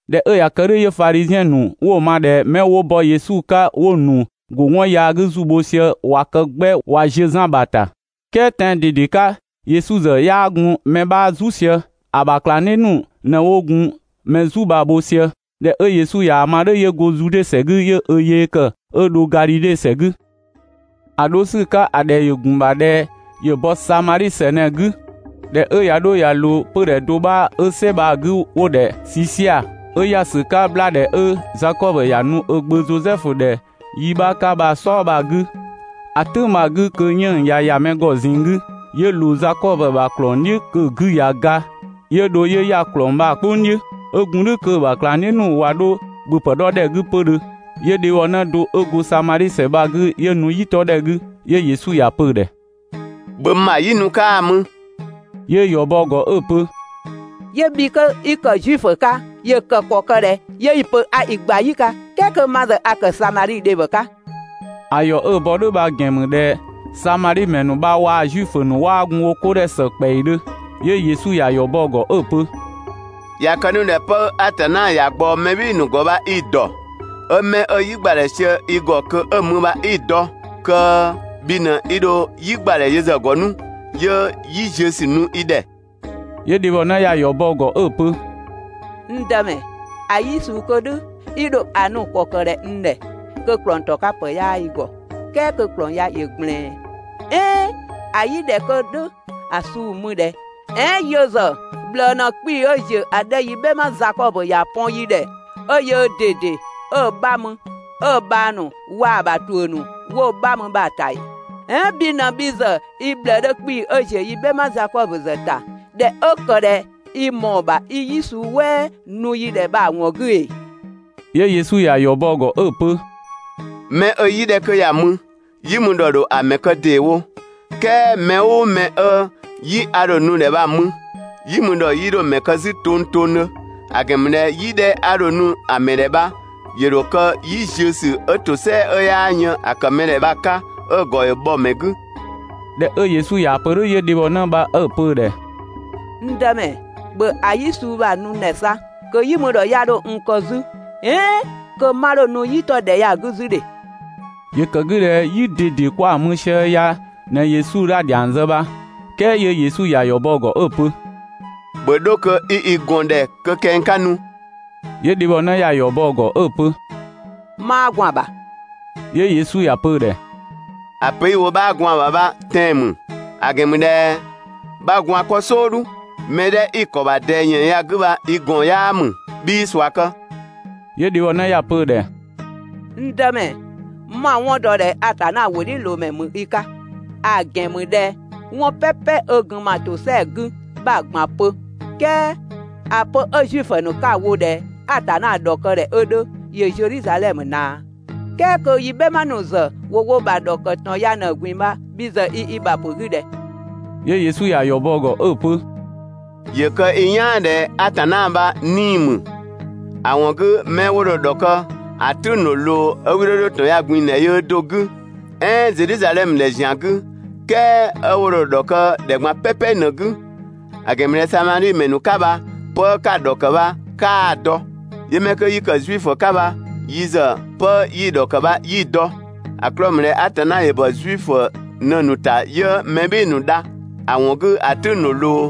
꞊Dhɛ 'ö ꞊ya kë "dhʋ̈ 'yö Fadhiziɛn ‑nu 'wo‑ ma ꞊dhɛ 'mɛ 'wo bɔ Yesu 'ka 'wo‑ ‑nu ‑go 'wɔn yaa 'gü ‑zu bho sië ꞊wa kë 'gbɛ ꞊wa ziö Zan ‑bha ‑ta, ("kɛɛ tɛan‑ ꞊dede 'ka, Yesu ‑zë 'yaa gun mɛ 'bha "zu sië. ‑A ‑bha ꞊klangdhiʋ̈ ‑nu ꞊në 'wo gun mɛ "zu bha‑ bho sië). ꞊Dhɛ 'ö Yesu ꞊yaa‑ ma "dhʋ̈, 'yö go Zude ‑sɛ 'gü 'yö ö yee ‑kë 'ö dho Gadhidhe ‑sɛ 'gü. ‑A 'dho ‑sü 'ka ‑a ‑dhɛ ‑gun ‑bha ꞊dhɛ ‑yö bɔ Samadhi ‑sɛ ꞊në‑ 'gü. ꞊Dhɛ 'ö ꞊ya 'dho ꞊ya ꞊loo 'pödhɛ do 'bha 'ö "sɛ bha‑ 'gü 'wo‑ ‑dhɛ Sisiaa, 'ö ‑ya ‑sü 'ka 'bhlaadhɛ 'ö Zakɔbö ‑ya nu ö gbö Zosɛfu ‑dhɛ yi 'bha 'ka bha‑ "sɔɔ bha‑ 'gü, ‑a "tʋ̈ng bha‑ 'gü kö 'yënng‑ ꞊ya ‑ya mɛ ‑gɔ ꞊zinng 'gü, 'yö ꞊loo Zakɔbö ‑bha ‑klɔng "dhiʋ̈ kö‑ 'gü ꞊ya ga, 'yö dho 'yö ‑ya ‑klɔng bha‑ "kpʋng "dhiʋ̈. 'Ö gun "dhʋ̈ kö‑ ‑bha ꞊klangdhiʋ̈ ‑nu ꞊wa 'dho ‑bhöpë 'dhɔ ‑dhɛ 'gü 'pödhö. 'Yö dhebhɔnë do 'ö go Samadhi ‑sɛ bha‑ 'gü 'ö nu "yi 'tɔdhɛ 'gü. 'Yö Yesu ‑ya pö‑ ‑dhɛ: «‑Bhö n ‑bha "yi nu 'kaa‑ mü!» 'Yö‑ ‑yɔ bɔ‑ ‑gɔ 'ö‑ pö: «'Yö bhi kö 'i ‑kë Zuifö 'ka ‑yö kë ‑kɔ ‑kë ꞊dhɛ 'yö 'i‑ pö a i gba "yi 'ka "kɛɛ kö ma ‑zë a ‑kë Samadhi dhebhɔ 'ka!» (‑A ‑yɔ 'ö‑ bɔ "dhʋ̈ bha‑ ‑gɛn ‑mü ꞊dhɛ Samadhi ‑mɛ ‑nu bha waa‑ Zuifö ‑nu 'waa gun wo 'ko ‑dhɛ ‑së ‑kpɛidhö.) 'Yö Yesu ‑ya ‑yɔ bɔ‑ ‑gɔ 'ö‑ pö: «꞊Ya kë 'nu ꞊dhɛ 'pë 'ö Atanna ‑ya ꞊gbaɔ mɛ "bhɩɩ‑ ‑nu ‑gɔ bha 'i‑ ‑dɔ, 'ö 'mɛ 'ö "yi ‑gbadhɛ sië i ‑gɔ kö 'ö‑ mü bha 'i‑ dɔ, kö bhi ꞊në 'i dho "yi ‑gbadhɛ yö ‑zë ‑gɔ 'nu 'yö "yi ziösü nu i ‑dhɛ.» 'Yö dhebhɔnë ‑ya ‑yɔ bɔ‑ ‑gɔ 'ö‑ pö: «N Dëmɛ, ‑a "yi 'kö "dhʋ̈ i ‑dho ‑a nu ‑kɔ kë ꞊dhɛ n ‑dhɛ kö ‑klɔng ‑tɔ 'ka ‑pë 'yaa i ‑gɔ, "kɛɛ kö ‑klɔng ya ‑yö ꞊gblɛɛn. ("Ɛɛn ‑a "yi 'dhɛ 'kö "dhʋ̈‑ suu‑ mü ꞊dhɛ? "Ɛɛn yö ‑zë ꞊bhlëë ꞊në 'kpii‑ 'ö ‑ziö ‑a 'dhɛ 'ö) yi "bhɛma Zakɔbö ‑ya pɔn yi ‑dhɛ, 'ö yöö ꞊dede 'ö‑ 'bha mü, 'ö‑ bhang ‑nu waa‑ ‑bha ‑tuʋ̈ ‑nu 'wo‑ 'bha mü 'pö ya‑ ‑ta ‑ee? "Ɛɛn bhi ꞊në bhi ‑zë i ꞊bhlëë 'dhö 'kpii‑ 'ö ‑ziö yi "bhɛma Zakɔbö ꞊dhɛ 'ö ‑kë ꞊dhɛ i ‑mɔɔ ‑bha 'i "yi suu "wɛɛ nu yi ‑dhɛ bha‑ ‑wɔn 'gü ‑ee?» 'Yö Yesu ‑ya ‑yɔ bɔ‑ ‑gɔ 'ö‑ pö: «Mɛ 'ö "yi 'dhɛ 'kö ya‑ mü, "yi mü ‑dhɔ ‑dho ‑a mɛ kë ‑deewo, "kɛɛ mɛ "ʋʋ mɛ 'ö "yi 'a dho‑ nu‑ ‑dhɛ bha‑ mü, "yi mü ‑dhɔ 'yii 'dho‑ ‑mɛ kë 'zü tongtongdhö; ‑a ‑gɛn ‑mü ꞊dhɛ "yi 'dhɛ 'a dho‑ nu‑ ‑mɛ ‑dhɛ bha ‑yö ‑dho kë "yi ziösü 'ö ‑tosɛa 'ö 'yaa yën ‑a ‑kë mɛ ‑dhɛ bha‑ 'ka 'ö‑ ‑gɔ ‑yö bhɔ‑ ‑mɛ 'gü.» ꞊Dhɛ 'ö Yesu ꞊yaa‑ pö "dhʋ̈, 'yö dhebhɔnë bha 'ö‑ pö‑ ‑dhɛ: «N Dëmɛ, ‑bhö ‑a "yi suu bha‑ nu n ‑dhɛ 'sa kö "yi mü ‑dhɔ 'ya 'dho n kë 'zü, "ɛɛn kö 'ma 'dho nu "yi 'tɔ ‑dhɛ ya‑ 'gü 'zü ‑dhe!» (‑Yö ‑kë 'gü ꞊dhɛ "yi ꞊dede kwa‑ mü sië ya ꞊në Yesu ‑ya ‑dhiang zë bha.) "Kɛɛ 'yö Yesu ‑ya ‑yɔ bɔ‑ ‑gɔ 'ö‑ pö: «‑Bhö 'dho kö 'i i ꞊gɔn ‑dhɛ kö kɛng 'ka nu!» 'Yö dhebhɔnë ‑ya ‑yɔ bɔ‑ ‑gɔ 'ö‑ pö: «'Maa gwaan‑ ‑bha.» 'Yö Yesu ‑ya pö‑ ‑dhɛ: «‑A pö 'i‑ wo 'bhaa gwaan‑ ‑bha bha tɛan‑ ‑mü, ‑a ‑gɛn ‑mü ꞊dhɛ 'bha gwaan‑ 'kpɔ "sɔɔdhu, mɛ 'dhɛ 'i‑ ‑kɔ ‑bha ꞊dɛɛ 'yënng‑ ya‑ 'gü bha i ꞊gɔn 'yaa ‑mü, 'bhii ꞊sua kë.» 'Yö dhebhɔnë ‑ya pö‑ ‑dhɛ: «N Dëmɛ, 'ma‑ 'wɔn dɔ ꞊dhɛ Atanna ‑wʋdhiʋ̈loomɛ ‑mü i 'ka, (‑a ‑gɛn ‑mü ꞊dhɛ 'wɔn "pɛpɛ 'ö gun ma ‑tosɛa 'gü 'bha‑ ꞊gban pö.) "Kɛɛ ‑a pö 'ö Zuifö ‑nu 'ka‑ wo ꞊dhɛ Atanna ‑dhɔkë ꞊dhɛ 'ö 'dhö ‑yö Zedhizadhɛmö ꞊naa, "kɛɛ kö yi "bhɛma ‑nu ‑zë ‑wo wo ‑bha ‑dhɔkë ‑tɔn ya ꞊në‑ ꞊gbin‑ bha (bhi ‑zë i i ‑bha ‑pö 'gü ꞊dhɛ?).» 'Yö Yesu ꞊ya ‑yɔ bɔ‑ ‑gɔ 'ö‑ pö: «‑Yö kë i "yaan ꞊dhɛ Atanna bha 'nii‑ ‑mü, ‑a ‑wɔn 'gü 'mɛ 'wo dho‑ ‑dhɔkë, ‑a "tʋ̈ng ‑dho ꞊loo 'ö 'wii 'dho 'dho ‑tɔn ya‑ ꞊gbin‑ ‑dhɛ yöö do‑ 'gü, "ɛɛn Zedhizadhɛmö ‑dhɛ ‑zian 'gü, ("kɛɛ 'ö 'wo dho‑ ‑dhɔkë ‑dhɛ ꞊gban "pɛpɛ ꞊në‑ 'gü); ‑a ‑gɛn ‑mü ꞊dhɛ Samadhi ‑mɛ ‑nu 'ka bha 'pë 'ka‑ ‑dhɔkë bha 'kaa‑ dɔ. 'Yö 'mɛ 'kö 'yi ‑kë Zuifö 'ka bha yi ‑zë 'pë 'yi‑ ‑dhɔkë bha 'yi‑ dɔ. ‑A 'klɔɔ‑ ‑mü ꞊dhɛ Atanna ‑yö ‑bɔ Zuifö ꞊në‑ ‑nu ‑ta 'yö mɛ "bhɩɩ‑ ‑nu dha. ‑A ‑wɔn 'gü ‑a "tʋ̈ng ‑dho ꞊loo,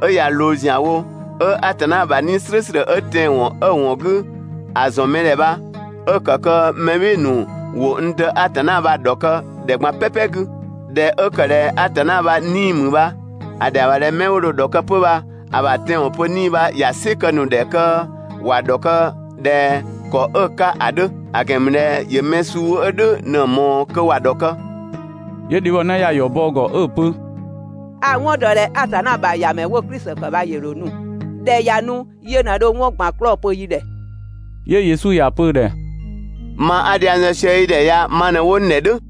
'ö ꞊ya ꞊loo ‑zianwo, 'ö Atanna ‑bha 'Nii‑ "slʋ̈ʋ̈slʋ̈ 'ö tɛanwɔn 'ö‑ ‑wɔn 'gü ‑a ‑zɔn mɛ ‑dhɛ bha 'ö‑ ‑kë kö mɛ "bhɩɩ‑ ‑nu ‑wo n Dë Atanna bha‑ ‑dhɔkë (‑dhɛ ꞊gban "pɛpɛ 'gü). ꞊Dhɛ 'ö ‑kë ꞊dhɛ Atanna bha 'Nii‑ ‑mü bha ‑a ‑dhɛa ‑bha ꞊dhɛ 'mɛ 'wo dho‑ ‑dhɔkë 'pö bha‑ ‑bha tɛanwɔn pö 'Nii‑ bha ‑ya "sɩ kë‑ ‑nu ‑dhɛ kö ‑wa ‑dhɔkë ꞊dhɛ ‑kɔ 'ö‑ 'ka ‑a 'dhö; ‑a ‑gɛn ‑mü ꞊dhɛ ‑yö mɛ suu 'ö "dhʋ̈ ꞊në‑ ꞊mɔɔ kö ‑wa ‑dhɔkë.» 'Yö dhebhɔnë ‑ya ‑yɔ bɔ‑ ‑gɔ 'ö‑ pö: «A‑ 'wɔn ‑dɔ ꞊dhɛ Atanna ‑bha ‑Yamɛ 'wo‑ Klisi ‑kë bha ‑yö ‑dho nu. ꞊Dhɛ ꞊ya nu yö ꞊në dho 'wɔn ꞊gban 'klɔɔ‑ pö yi ‑dhɛ.» 'Yö Yesu ‑ya pö‑ ‑dhɛ: «Ma 'a dhiang zë sië i ‑dhɛ ya ma ꞊në 'wo n ‑dhɛ "dhʋ̈.»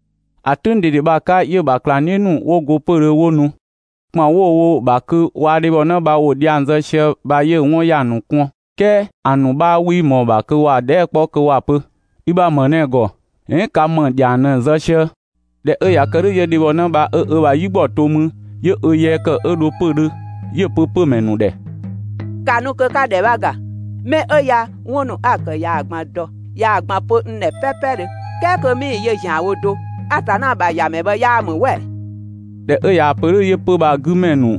‑A "tʋ̈ng ꞊dede bha‑ 'ka 'yö‑ ‑bha ꞊klangdhiʋ̈ ‑nu 'wo go 'pödhö 'wo nu. ‑Kpan 'wo‑ wo‑ ‑bha kö waa‑ dhebhɔnë bha ‑wo dhiang zë sië bha 'yö‑ 'wɔn ‑ya ‑nu kɔn, "kɛɛ ‑a ‑nu 'bha 'wii ꞊mɔɔ‑ ‑bha kö ‑wa dhɛɛ" 'kpɔ kö ‑wa pö: «I ‑bha ‑më ꞊në‑ ‑gɔ?» "ɛɛn «ka ‑më ‑dhiang ꞊në‑ zë sië?». ꞊Dhɛ 'ö ꞊ya kë "dhʋ̈, 'yö dhebhɔnë bha 'ö ö bha "yigbɔ to 'mü 'yö ö yee ‑kë 'ö dho 'pödhö 'yö‑ pö 'pömɛ ‑nu ‑dhɛ: «‑Ka nu kö 'ka ‑dhɛ 'bha ‑ga! 'Mɛ 'ö ya 'wɔn ‑nu 'a‑ ‑kë ‑ya ꞊gban ‑dɔ, ꞊yaa‑ ꞊gban pö n ‑dhɛ "pɛɛpɛdhö ("kɛɛ kö 'mii‑ yö ‑zianwo do)! Atanna ‑bha ‑Yamɛ bha 'yaa ‑mü "wɛ ‑ee?» ꞊Dhɛ 'ö ꞊yaa‑ pö "dhʋ̈ 'yö 'pö‑ bha‑ 'gü ‑mɛ ‑nu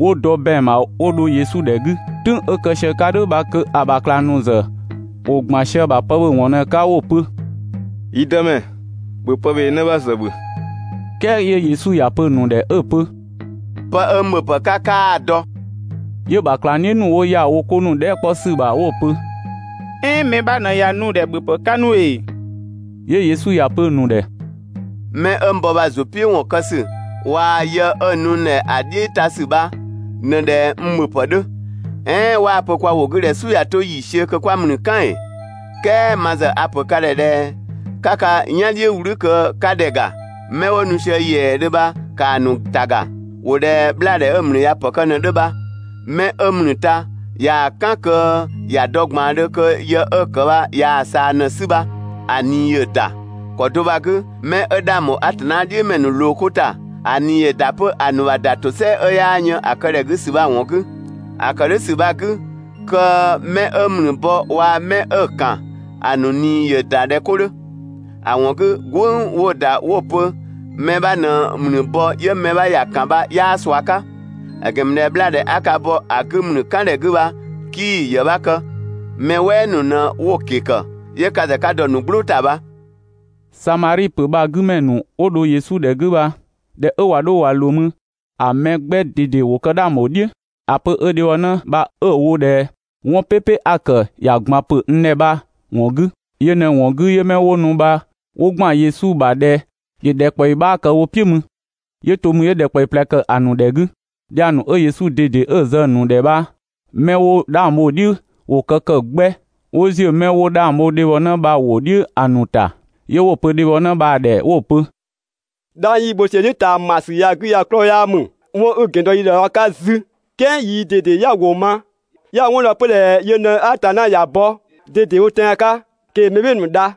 'wo dɔ ‑bɛang ‑bha 'wo dho Yesu ‑dhɛ 'gü. "Tʋ̈ng 'ö kë sië‑ 'ka "dhʋ̈ bha kö‑ ‑bha ꞊klangdhiʋ̈ ‑nu ‑zë ‑wo ‑gban sië‑ ‑bha pë ‑bhö ‑wɔn ꞊në‑ 'ka 'wo‑ pö: «Yi Dëmɛ, ‑bhö pëbhee 'në 'bha ‑zë ‑bhö.» "Kɛɛ 'yö Yesu ‑ya pö‑ ‑nu ‑dhɛ 'ö‑ pö: «'Pë 'ö n ‑bhöpë 'ka 'kaa‑ dɔ.» 'Yö‑ ‑bha ꞊klangdhiʋ̈ ‑nu 'wo ‑ya wo 'ko ‑nu dhɛɛ" 'kpɔ ‑sü ‑bha 'wo‑ pö: «"Ɛɛn mɛ 'bha ꞊në ꞊ya nu‑ ‑dhɛ ‑bhöpë 'ka 'nu ‑ee?» 'Yö Yesu ‑ya pö‑ ‑nu ‑dhɛ: «'Mɛ 'ö n bɔ bha‑ ‑zʋ "piʋ̈ ‑wɔn kë ‑sü waa‑ yë 'ö‑ nu n ‑dhɛ ‑a "dhiʋ̈ ‑ta ‑sü bha ꞊në ꞊dhɛ n ‑bhöpë 'dhö. "Ɛɛn 'waa‑ pö kwa ‑wʋ 'gü ꞊dhɛ «"Su ꞊ya 'to ‑yiisiö kö 'kwa ‑mlü "kan ‑ee?») "Kɛɛ ma ‑zë a‑ ‑pö ka ‑dhɛ ꞊dhɛ 'ka ka "yan "dhiʋ̈ "wlü kö 'ka ‑dhɛ ‑ga. 'Mɛ 'wo nu sië ‑yɛɛdhö bha ‑kaa ‑nu ‑ta ‑ga, ‑wo ꞊dhɛ 'bhlaadhɛ 'ö‑ ‑mlü ꞊ya ‑pë kë ꞊në‑ 'dhö bha. 'Mɛ 'ö ‑mlü ta ꞊yaa‑ "kan kö ‑ya dɔ ꞊gbaandhö kö yë 'ö‑ ‑kë bha ꞊yaa‑ ꞊saa ꞊në‑ 'sü bha, ‑a ꞊nii ‑yö ‑da. ‑Kɔ do bha‑ 'gü 'mɛ 'ö 'dhang ‑bho Atanna "dhiʋ̈ ‑mɛ ‑nu ꞊loo 'ko ‑ta, ‑a ꞊nii ‑yö ‑da 'pö ‑a ‑nu ‑bha ‑da ‑tosɛa 'ö 'yaa yën ‑a kë ‑dhɛ 'gü ‑sü bha‑ ‑wɔn 'gü. ‑A ‑kë "dhʋ̈ ‑sü bha‑ 'gü, kö 'mɛ 'ö ‑mlü bɔ waa‑ 'mɛ 'ö‑ ‑kan, ‑a ‑nu ꞊nii ‑yö ‑da ꞊dhɛ 'ko 'dhö. ‑A ‑wɔn 'gü "gwënng 'wo‑ ‑da 'wo‑ pö: «Mɛ 'bha ꞊në ‑mlü bɔ 'yö mɛ 'bha ‑ya ‑kan» bha 'yaa ꞊sua 'ka, ‑a ‑gɛn ‑mü ꞊dhɛ 'bhlaadhɛ 'a ka bɔ‑ 'gü ‑mlü "kan ‑dhɛ 'gü bha 'kii‑ ‑yë 'bha kë, mɛ "wɛɛ ‑nu ꞊në 'wo‑ ‑ke ‑kë 'yö ka ‑zë ka dɔ‑ ‑nu "gblʋʋ ‑ta bha. Samadhi ‑pö bha‑ 'gü ‑mɛ ‑nu 'wo dho Yesu ‑dhɛ 'gü bha ꞊dhɛ 'ö ꞊wa 'dho ꞊wa ꞊loo mü, ‑a mɛ 'gbɛ ꞊dede kë 'dhang ‑bho "dhiʋ̈ ‑a pö 'ö dhebhɔnë bha 'ö‑ wo ꞊dhɛ «'Wɔn "pɛpɛ 'a‑ ‑kë ꞊yaa‑ ꞊gban‑ pö n ‑dhɛ bha‑ ‑wɔn 'gü.» Yö ꞊në‑ ‑wɔn 'gü 'yö 'mɛ 'wo nu bha 'wo ‑gban Yesu ‑bha ꞊dhɛ ‑yö ‑dhɛkpaɔyi 'bha kë wo "piʋ̈ mü. 'Yö to 'mü 'yö ‑dhɛkpaɔyi ꞊plɛ ‑kë ‑a ‑nu ‑dhɛ 'gü. Dhiang ‑nu 'ö Yesu ꞊dede 'ö‑ zë‑ ‑nu ‑dhɛ bha 'mɛ 'wo 'dhang bho‑ "dhiʋ̈ ‑wo kë ‑kë 'gbɛ, 'wo ‑ziö 'mɛ 'wo 'dhang bho dhebhɔnë bha‑ ‑wʋ "dhiʋ̈ ‑a ‑nu ‑ta. 'Yö 'wo‑ pö dhebhɔnë bha‑ ‑dhɛ 'wo‑ pö: «'Dhang 'yi‑ bho sië‑ "dhiʋ̈ ꞊taamasü ya‑ 'gü ya‑ 'klɔɔ‑ 'yaa ‑mü 'wɔn 'i‑ ‑gɛn dɔ yi ‑dhɛ bha‑ 'ka 'zü, "kɛɛ yii ꞊dede 'ya‑ ‑wʋ ma, 'ya‑ 'wɔn dɔ 'pö ꞊dhɛ yö ꞊në Atanna ‑ya bɔ ꞊dedewo tɛan‑ 'ka kö ‑yö mɛ "bhɩɩ‑ ‑nu dha.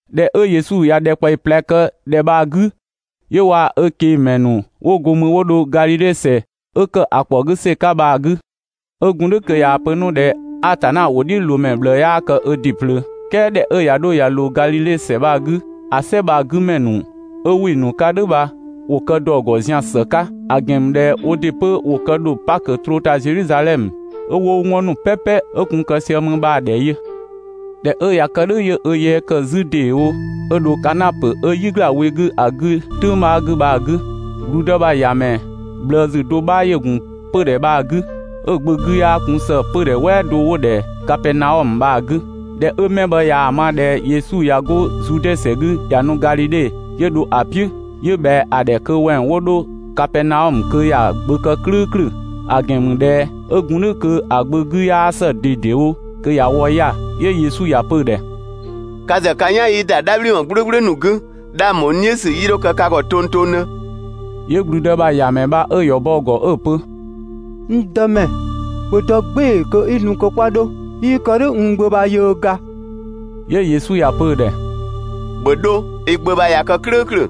꞊Dhɛ 'ö Yesu ꞊ya ‑dhɛkpaɔyi ꞊plɛ kë ‑dhɛ bha‑ 'gü, 'yö waa‑ ꞊kengmɛ ‑nu 'wo go 'mü 'wo dho Gadhidhe ‑sɛ ('ö ‑kë ‑a ‑kpɔ 'gü ‑sɛ 'ka bha‑) 'gü. 'Ö gun "dhʋ̈ kö ꞊yaa‑ pö 'nu ꞊dhɛ «Atanna ‑wʋdhiʋ̈loomɛ ꞊bhlëë 'yaa kë ö ‑dɩ ꞊plöö». "Kɛɛ ꞊dhɛ 'ö ꞊ya 'dho ꞊ya ꞊loo Gadhidhe ‑sɛ bha‑ 'gü, ‑a "sɛ bha‑ 'gü ‑mɛ ‑nu 'ö ‑wɩ ‑nu 'ka "dhʋ̈ bha ‑wo kë ‑dɔ ‑gɔ zian‑ ‑së 'ka, ‑a ‑gɛn ‑mü ꞊dhɛ woo ‑dɩ 'pö ‑wo kë ‑dho Pakö troo ‑ta Zedhizadhɛmö 'ö 'wo 'wɔn ‑nu "pɛpɛ 'ö gun‑ kë sië 'mü bha‑ ‑dhɛ yö. ꞊Dhɛ 'ö ꞊ya kë "dhʋ̈ 'yö ö yee ‑kë 'zü ‑deewo 'ö dho Kana ‑pö 'ö "yi ‑gla we 'gü ‑a 'gü "tʋ̈ng 'bha 'gü bha‑ 'gü. ‑Gblüdë ‑bha ‑yamɛ ꞊bhlëësü do 'bha ‑yö ‑gun 'pö‑ bha‑ 'gü 'ö‑ gbö do 'gü 'yaa gun ‑së 'pödhɛ "wɛɛ 'dhɛ 'wo‑ ‑dhɛ Kapɛɛnaɔmö bha‑ 'gü. ꞊Dhɛ 'ö mɛ bha ꞊yaa‑ ma ꞊dhɛ Yesu ꞊ya 'go Zude ‑sɛ 'gü ꞊ya nu Gadhidhe, 'yö dho‑ "piʋ̈, 'yö ꞊bhɛa‑ ‑dhɛ kö wɛng 'wo 'dho Kapɛɛnaɔmö kö ‑ya gbö kë "klʋ̈ʋ̈klʋ̈, ‑a ‑gɛn ‑mü ꞊dhɛ 'ö gun "dhʋ̈ kö‑ gbö 'gü 'yaa ‑së ꞊dedewo, kö ꞊ya wɔ 'ya‑. 'Yö Yesu ‑ya pö‑ ‑dhɛ: «Ka ‑zë ka "yan 'yii ‑da "dhabhliwɔn "gblʋ̈gblʋ̈ ‑nu 'gü, 'dhang ‑bho n "dhiʋ̈ ‑sü 'yii 'dho kë ka ‑gɔ tongtongdhö.» 'Yö ‑gblüdë ‑bha ‑yamɛ bha 'ö‑ ‑yɔ bɔ‑ ‑gɔ 'ö‑ pö: «N Dëmɛ, ‑bhö dɔ "gbɩɩ‑ kö i nu kö 'kwa 'dho, 'yii kë "dhʋ̈ n gbö bha yöö ga.» 'Yö Yesu ‑ya pö‑ ‑dhɛ: «‑Bhö 'dho, i gbö bha ꞊ya kë "klʋ̈ʋ̈klʋ̈!»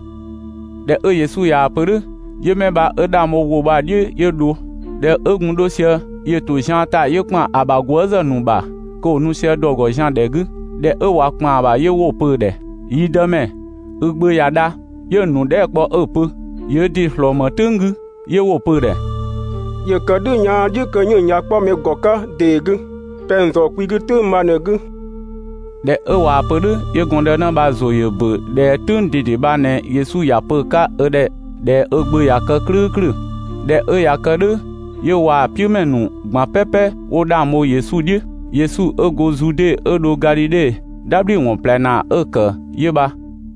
꞊Dhɛ 'ö Yesu ꞊yaa‑ pö "dhʋ̈, 'yö 'mɛ bha 'ö 'dhang bho‑ ‑wʋ bha‑ "dhiʋ̈ 'yö dho. ꞊Dhɛ 'ö gun 'dho sië, ‑yö ‑to zian ‑ta 'yö ‑kpan ‑a ‑bha gwëëzë ‑nu ‑bha kö ‑wo nu sië ‑dɔ ‑gɔ zian ‑dhɛ 'gü. ꞊Dhɛ 'ö ꞊wa ‑kpan ‑bha 'yö 'wo‑ pö‑ ‑dhɛ: «Yi Dëmɛ, i gbö ꞊ya dha!» 'Yö‑ ‑nu dhɛɛ" kpɔ 'ö‑ pö: «‑Yö ö ‑dɩ ‑slɔɔ ‑më "tʋ̈ng 'gü?» 'Yö 'wo‑ pö‑ ‑dhɛ: «‑Yö ‑kë "dhʋ̈ yaan "dhiʋ̈ kö 'yënng‑ ꞊ya 'kpɔ mɛ ‑gɔ 'ka ‑dee 'gü. Pɛng‑ ‑zɔɔ kwi 'gü "tʋ̈ng bha ꞊në‑ 'gü.» ꞊Dhɛ 'ö ꞊waa‑ pö "dhʋ̈ 'yö gɔndënë bha‑ ‑zʋ ‑yö ‑bö ꞊dhɛ "tʋ̈ng ꞊dede bha ꞊në Yesu ‑ya pö‑ 'ka ö ‑dhɛ ꞊dhɛ ö gbö ꞊ya kë "klʋ̈ʋ̈klʋ̈. ꞊Dhɛ 'ö ꞊ya kë "dhʋ̈ 'yö waa‑ "piʋ̈mɛ ‑nu ꞊gban "pɛpɛ 'wo 'dhang bho Yesu "dhiʋ̈. Yesu 'ö go Zude 'ö dho Gadhidhe, "dhabhliwɔn ꞊plɛ ‑naa 'ö‑ ‑kë 'yö bha.